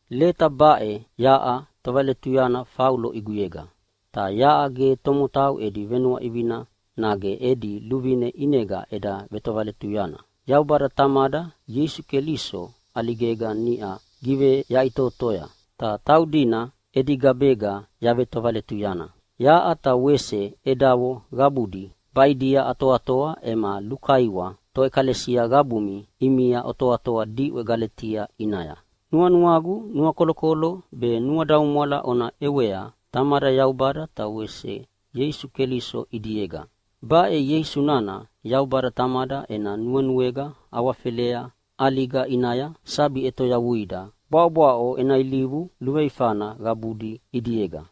Leta baʼe yaʼa tovaletuyana Faulo ʼiguyega. Ta yaʼa ge tomotau edi venuaʼivina nage edi luvine ʼinega eda vetovaletuyana. Yaubada Tamada Ieisu Keliso ʼaligega niʼa giveyaʼitotoya, ta taudina edi gabega yavetovaletuyana. Yaʼa ta wese edavo qabudi baʼidia atoatoa ema lukaiwa toʼekalesia qabumi ʼimia otoatoa diʼwe Galetia ʼinaya. Nuanuagu nuakolokolo be nuadaumwala ona ʼewea Tamada Yaubada ta wese Ieisu Keliso ʼidiega. Baʼe Ieisu nana Yaubada Tamada ena nuenuega awafelea ʼaliga ʼinaya sabi ʼetoyavuida bwaʼobwaʼo ena ilivu luveifana qabudi ʼidiega.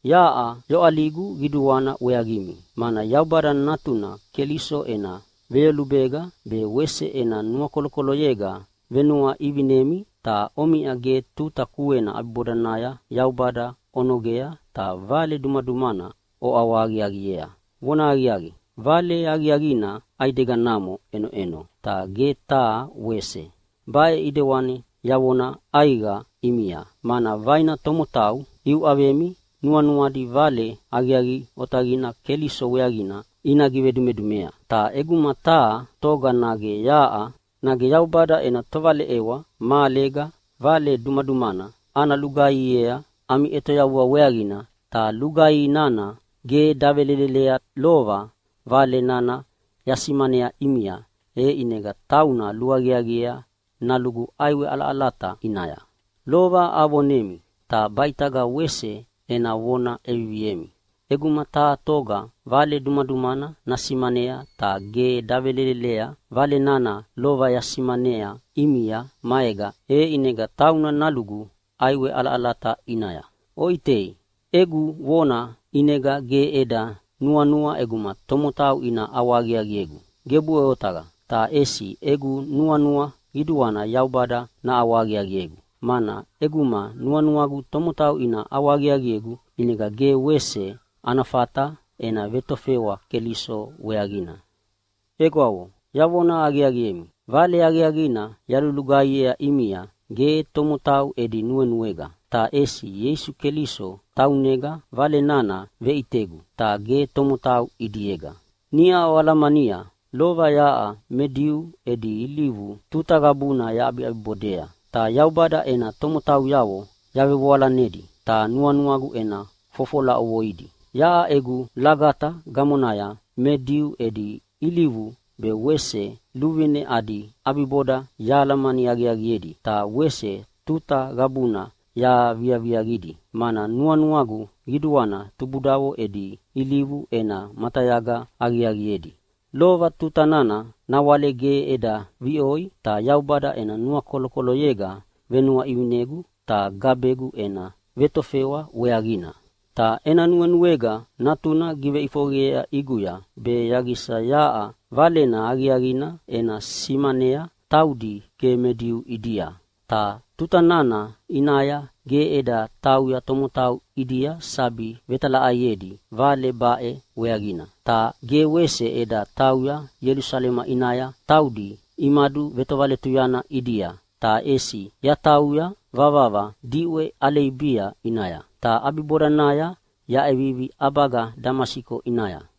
Yaʼa yoʼaligu qiduana weaqimi! Mana Yaubada Natuna Keliso ena veyolubega be wese ena nuakolokoloyega venuaʼivinemi, ta omiʼa ge tuta kuena ʼabibodanaya Yaubada onogea ta vale dumadumana oʼawahaqiaqiea. Vonahaqiaqi, Vale Aqiaqina ʼaideganamo ʼenoʼeno, ta ge taha wese! Baʼe ʼidewani yavona ʼaiqa ʼimia, mana vaina tomotau iuʼavemi nuanuadi Vale Aqiaqi Otaqina Keliso weaqina ina givedumedumea. Ta ʼeguma taha toga nage yaʼa, nage Yaubada ena tovaleʼewa mahalega vale dumadumana ana lugaihiea ami ʼetoyavua weaqina, ta lugaihi nana ge davelelelea lova Vale nana yasimanea ʼimia, e ʼinega tauna luaqiaqiea nalugu ʼaiwe ʼalaʼalata ʼinaya. Lova avonemi, ta baʼitaga wese ena vona ʼeviviemi: ʼEguma taha toga vale dumadumana nasimanea ta ge davelelelea Vale nana lova yasimanea ʼimia maega, e ʼinega tauna nalugu ʼaiwe ʼalaʼalata ʼinaya. Oʼitei, egu vona ʼinega ge eda nuanua ʼeguma tomotau ina ʼawahaqiaqiegu. Gebuʼe otaqa! Ta ʼesi egu nuanua qiduana Yaubada naʼawahaqiaqiegu! Mana ʼeguma nuanuagu tomotau ina ʼawahaqiaqiegu ʼinega ge wese ana fata ena vetofewa Keliso weaqina. Egwavo, yavona aqiaqiemi, Vale Aqiaqina yalulugaihiea ʼimia ge tomotau edi nuenuega. Ta ʼesi Ieisu Keliso taunega Vale nana veʼitegu, ta ge tomotau ʼidiega. Niʼa oalamania lova yaʼa me Diu edi ilivu tuta qabuna yaʼabibodea, ta Yaubada ena tomotauyavo yavevoalanedi ta nuanuagu ena fofola ʼovoidi. Yaʼa egu lagata gamonaya me Diu edi ilivu be wese luvine adi ʼabiboda yahalamani aqiaqiedi ta wese tuta qabuna yaviaqidi, mana nuanuagu qiduana tubudavo edi ilivu ena matayaga aqiaqiedi. Lova tuta nana nawale ge eda viʼoi ta Yaubada ena nuakolokoloyega venuaʼivinegu ta gabegu ena vetofewa weaqina. Ta ena nuenuega Natuna giveʼifoqeyea ʼiguya be yaqisa yaʼa Valena Aqiaqina ena simanea taudi ge me Diu ʼidia. Ta tuta nana ʼinaya ge eda tauya tomotau ʼidia sabi vetalaʼaiedi Vale baʼe weaqina. Ta ge wese eda tauya Ielusalema ʼinaya taudi imaduvetovaletuyana ʼidia, ta ʼesi yatauya vavava diʼwe Aleibia ʼinaya. Ta ʼabibodanaya yaʼevivi ʼabaga Damasiko ʼinaya.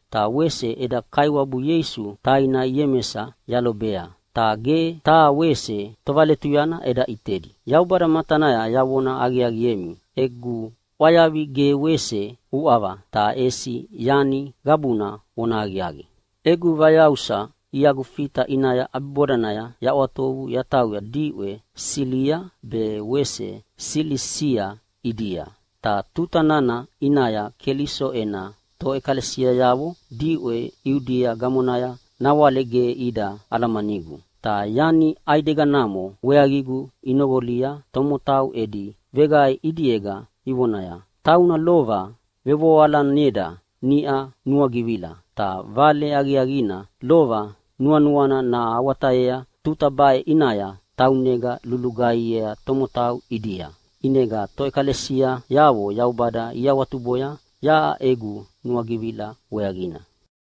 Ta wese eda Kaiwabu Ieisu taina Iemesa yalobea, ta ge taha wese tovaletuyana eda ʼitedi. Yaubada matanaya yavona aqiaqiemi egu ʼwayavi ge wese uʼava, ta ʼesi yani qabuna vonahaqiaqi. Egu vayausa iagu Fita ʼinaya ʼabibodanaya yaʼwatovu yatauya diʼwe Silia be wese Silisia ʼidia. Ta tuta nana ʼinaya Keliso ena toʼekalesiayavo diʼwe Iudia gamonaya nawale ge ida alamanigu. Ta yani ʼaideganamo weaqigu inoqolia tomotau edi veqae ʼidiega ivonaya, “Tauna lova vevoalaneda niʼa nuagivila, ta Vale Aqiaqina lova nuanuana nahawatayea tuta baʼe ʼinaya taunega lulugaihiea tomotau ʼidia.” ʼInega toʼekalesiayavo Yaubada iawatuboya yaʼa egu nuagivila weaqina.